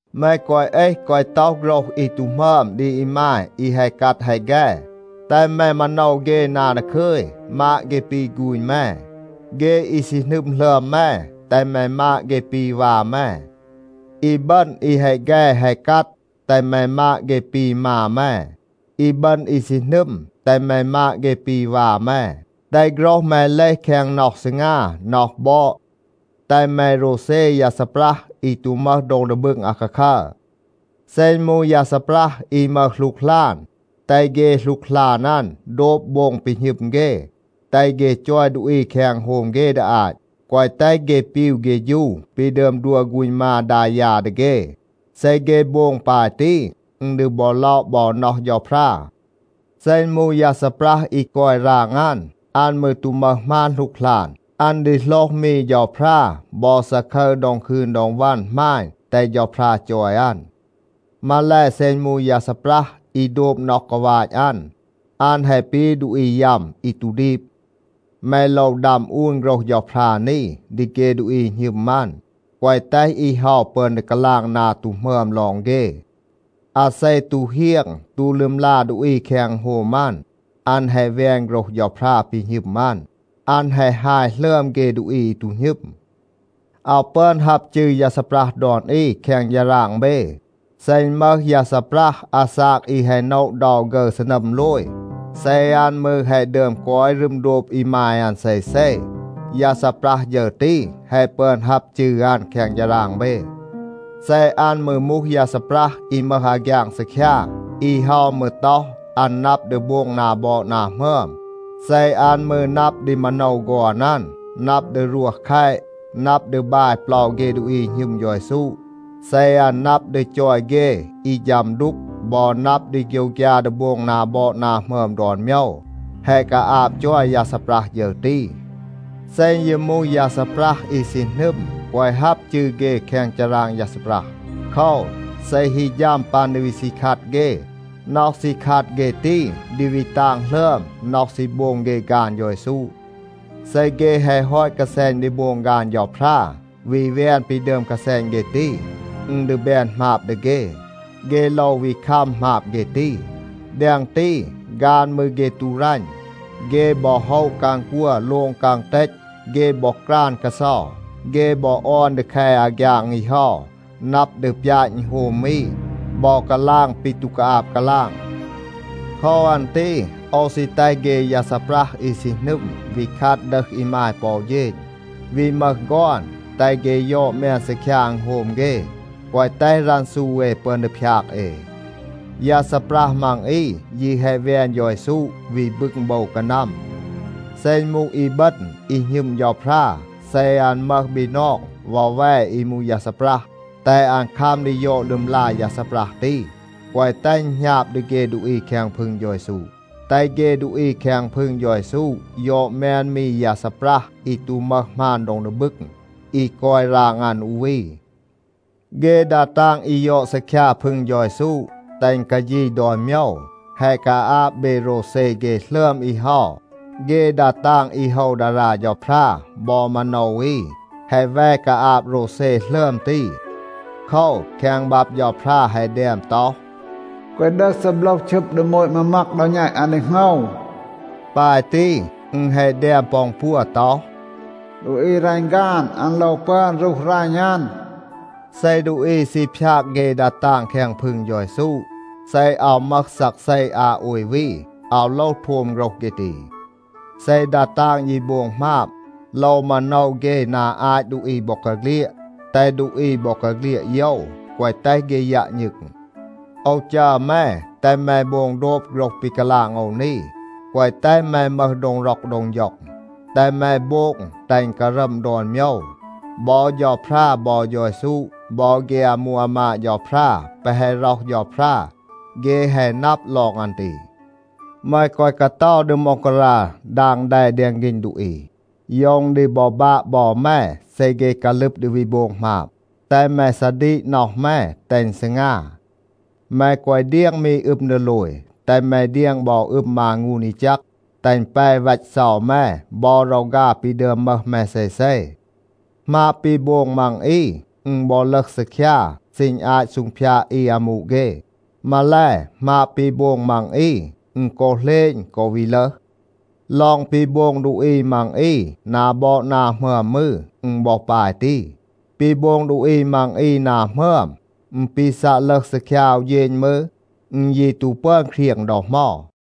แม แกวะ เอห, แกวะ ต็อห โฆรห อี ตู หมึอม ดี อีมาย อี แฮะ กัด แฮะ แฆ. แตห แม มาโนว เฆ นา ดาคึย, มาด เฆ ปี ฆูณ แม. เฆ อี ซี หนึม หลึอม แม, แตห แม มาด เฆ ปี วา แม. อีบึณ อี แฮะ แฆ แฮะ กัด, แตห แม มาด เฆ ปี มา แม. อีบึณ อี ซี หนึม, แตห แม มาด เฆ ปี วา แม. แตห โฆรห แม เลห แคง น็อห ซีงา, น็อห บอด. แตห แม โรวเซ ยา ซีปรัห อี ตู มึห โดง ดี บึง อาคาคัร. เซ อึณ มูห ยา ซีปรัห อี มึห หลูกหลาน, แตห เฆ หลูกหลาน อัน โบง โดบ ปี หณึม เฆ, แตห เฆ จอย ดูอี แคง อึณโฮม เฆ ดี อาต, แกวะ แตห เฆ ปีว เฆฌู ปี ดึอม ดัว ฆูณ มา ดา ยา ดี เฆ. เซ เฆ โบง ปาย ตี, อึณ ดี บอ ล็อะ บอ น็อห เฌาพรา. เซ อึณ มูห ยา ซีปรัห อี กอย ราง อัน, อัน มืร ตู มึห หมาน หลูกหลาน, อัน ดี โหลห มี เฌาพรา บอ ซาคึร ดอง คืน ดอง วัน หมาณ, แตห เฌาพรา จอย อัน. มาแล, เซ อึณ มูห ยา ซีปรัห อี โดบ น็อห กาวาต อัน, อัน แฮะ ปี ดูอี ยัม อี ตู ดีบ. แม โลว ดัม อูน โฆรห เฌาพรา นี ดี เฆ ดูอี หณึม อัน, แกวะ แตห อี เฮา ปึอน ดี กาลาง นา ตู หมึอม ลอง เฆ. อาเซ ตู เฮียง ตู ลึมลา ดูอี แคง อึณโฮม อัน, อัน แฮะ แวน โฆรห เฌาพรา ปี หณึม อัน. อัน แฮะ ฮาย หลึอม เฆ ดูอี อี ตู หณึม. อาว ปึอน ฮับ จืร ยา ซีปรัห ดอน อี แคง ฌาราง เบ. เซ อึณ มึห ยา ซีปรัห อาซาก อี แฮะ โนะ เดา ฆึร ซีนัม โลย, เซ อัน มืร แฮะ ดึอม กอย รึม โดบ อีมาย อัน เซเซ, ยา ซีปรัห ฌึร ตี, แฮะ ปึอน ฮับ จืร อัน แคง ฌาราง เบ. เซ อัน มืร มูห ยา ซีปรัห อี มึห อาฆยาง ซีคยา, อี เฮา มืร ต็อห, อัน นับ ดี โบง นา บอด นา หมึอม, เซ อัน มืร นับ ดี มาโนว ฆอน อัน, นับ ดี รวห แคต, นับ ดี บาย เปลา เฆ ดูอี อี หณึม เฌา เยซู, เซ อัน นับ ดี จอย เฆ อี ฌัม ดูก บอ นับ ดี โฆยวฆยา ดี โบง นา บอด นา หมึอม ดอน โมยว, แฮะ กาอาบ จอย ยา ซีปรัห ฌึร ตี. เซ อึณ ยี มูห ยา ซีปรัห อี ซี หนึม, แกวะ ฮับ จืร เฆ แคง ฌาราง ยา ซีปรัห. โคว, เซ ฮี ฌัม ปัน ดี วี ซี คัด เฆ, น็อห ซี คัด เฆ ตี ดี วี ตาง หลึอม น็อห ซี โบง เฆ ฆาน เฌา เยซู. เซ เฆ แฮะ ฮอต กาแซณ ดี โบง ฆาน เฌาพรา, วี แวน ปี ดึอม กาแซณ เฆ ตี, อึณ ดี แบน หมาบ ดี เฆ. เฆ โลว วี คัม หมาบ เฆ ตี. แดง ตี, ฆาน มืร เฆ ตู รัณ. เฆ บอ โฮะ กาง กัว, โลง กาง เตต, เฆ บอ กราน กาเซา. เฆ บอ ออน ดี แค อาฆยาง อี เฮา, นับ ดี ปยาต อึณโฮม อี บอ กาลาง ปี ตู กาอาบ กาลาง. โคว อัน ตี โอว ซี แตห เฆ ยา ซีปรัห อี ซี หนึม วี คัด ดึห อีมาย ปอ อู เฌณ, วี มึห ฆอน, แตห เฆ ยอด แมน ซีคยา อึณโฮม เฆ, แกวะ แตห รันซู เอ ปึอน ดี พยาก เอ. ยา ซีปรัห มัง อี ยี แฮะ แวน เฌา เยซู, วี บึง โบว กานัม. เซ อึณ มูห อีบึณ อี หณึม เฌาพรา, เซ อัน มึห บีนอง วอแว อี มูห ยา ซีปรัห, แตห อัน คัม ดี ยอด ลึมลา ยา ซีปรัห ตี. แกวะ แตห อึณ หณาบ ดี เฆ ดูอี แคง พึง เฌา เยซู. แตห เฆ ดูอี แคง พึง เฌา เยซู ยอด แมน มี ยา ซีปรัห อี ตู มึห หมาน โดง ดี บึง, อี กอย ราง อัน อู วี. เฆ ดา ตาง อี ยอด ซีคยา พึง เฌา เยซู, แตห อึณ กาฌี ดอน โมยว, แฮะ กาอาบ เบ โรวเซ เฆ หลึอม อี เฮา. เฆ ดา ตาง อี โฮว ดารา เฌาพรา บอ มาโนว อี, แฮะ แว กาอาบ โรวเซ หลึอม ตี. โคว, แคง บับ เฌาพรา แฮะ แดม ต็อห, “แกวะ ดึห ซีโบลห ชึบ ดี โมต มามัก ดอ แณต อัน ดี โหงว.” ปาย ตี, อึณ แฮะ แดม ปอ อึณปัว ต็อห, “ดูอี อี รัณ ฆาน, อัน โลว ปึอน รูห รัณ อัน.” เซ ดูอี ซี พยาก เฆ ดา ตาง แคง พึง เฌา เยซู, เซ อาว มึห ซักเซ อา โอย วี, อาว โลว โทม โฆรห เฆ ตี. เซ ดา ตาง ยี โบง หมาบ, โลว มาโนว เฆ นา อาต ดูอี บอกาเฆลียด, แตห ดูอี บอกาเฆลียด โยว, แกวะ แตห เฆ ยัะ ณึง. โอว จัร แม, แตห แม โบง โดบ โฆรห ปี กาลาง โอว นี, แกวะ แตห แม มึห โดง ร็อก โดง ฌ็อง, แตห แม โบง แตห อึณ การัม ดอน โมยว. บอ เฌาพรา, บอ เฌา เยซู, บอ เฆ อามู อามาด เฌาพรา แปะ แฮะ ร็อห เฌาพรา, เฆ แฮะ นับ ลอง อัน ตี. แม แกวะ กาเตา ดี ม็องการา ดาง แด แดง ฆีณ ดูอี. โยว อึณ ดี บอ บาะ บอ แม เซ เฆ กาลึบ ดี วี โบง หมาบ. แตห แม ซาดีก น็อห แม, แตห อึณ ซีงา. แม แกวะ เดียง มี อึม ดีโลย. แตห แม เดียง บอ อึม มางูน อี แจก, แตห อึณ แป วัต เซา แม บอ รอฆา ปี ดึอม มึห แม เซเซ. หมาบ ปี โบง มัง อี, อึณ บอ ลึห ซีคยา ซีณ อาต ซูงพยาด อี อามู เฆ. มาแล, หมาบ ปี โบง มัง อี, อึณ กอ เหลณ, กอ วี ลึห. ลอง ปี โบง ดูอี มัง อี นา บอด นา หมึอม มืร, อึณ บอ ปาย ตี. ปี โบง ดูอี มัง อี นา หมึอม, อึณ ปี ซัะ ลึห ซีคยา อู เฌณ มืร, อึณ ยี ตู ปึอน เครียง ดอ เหมา.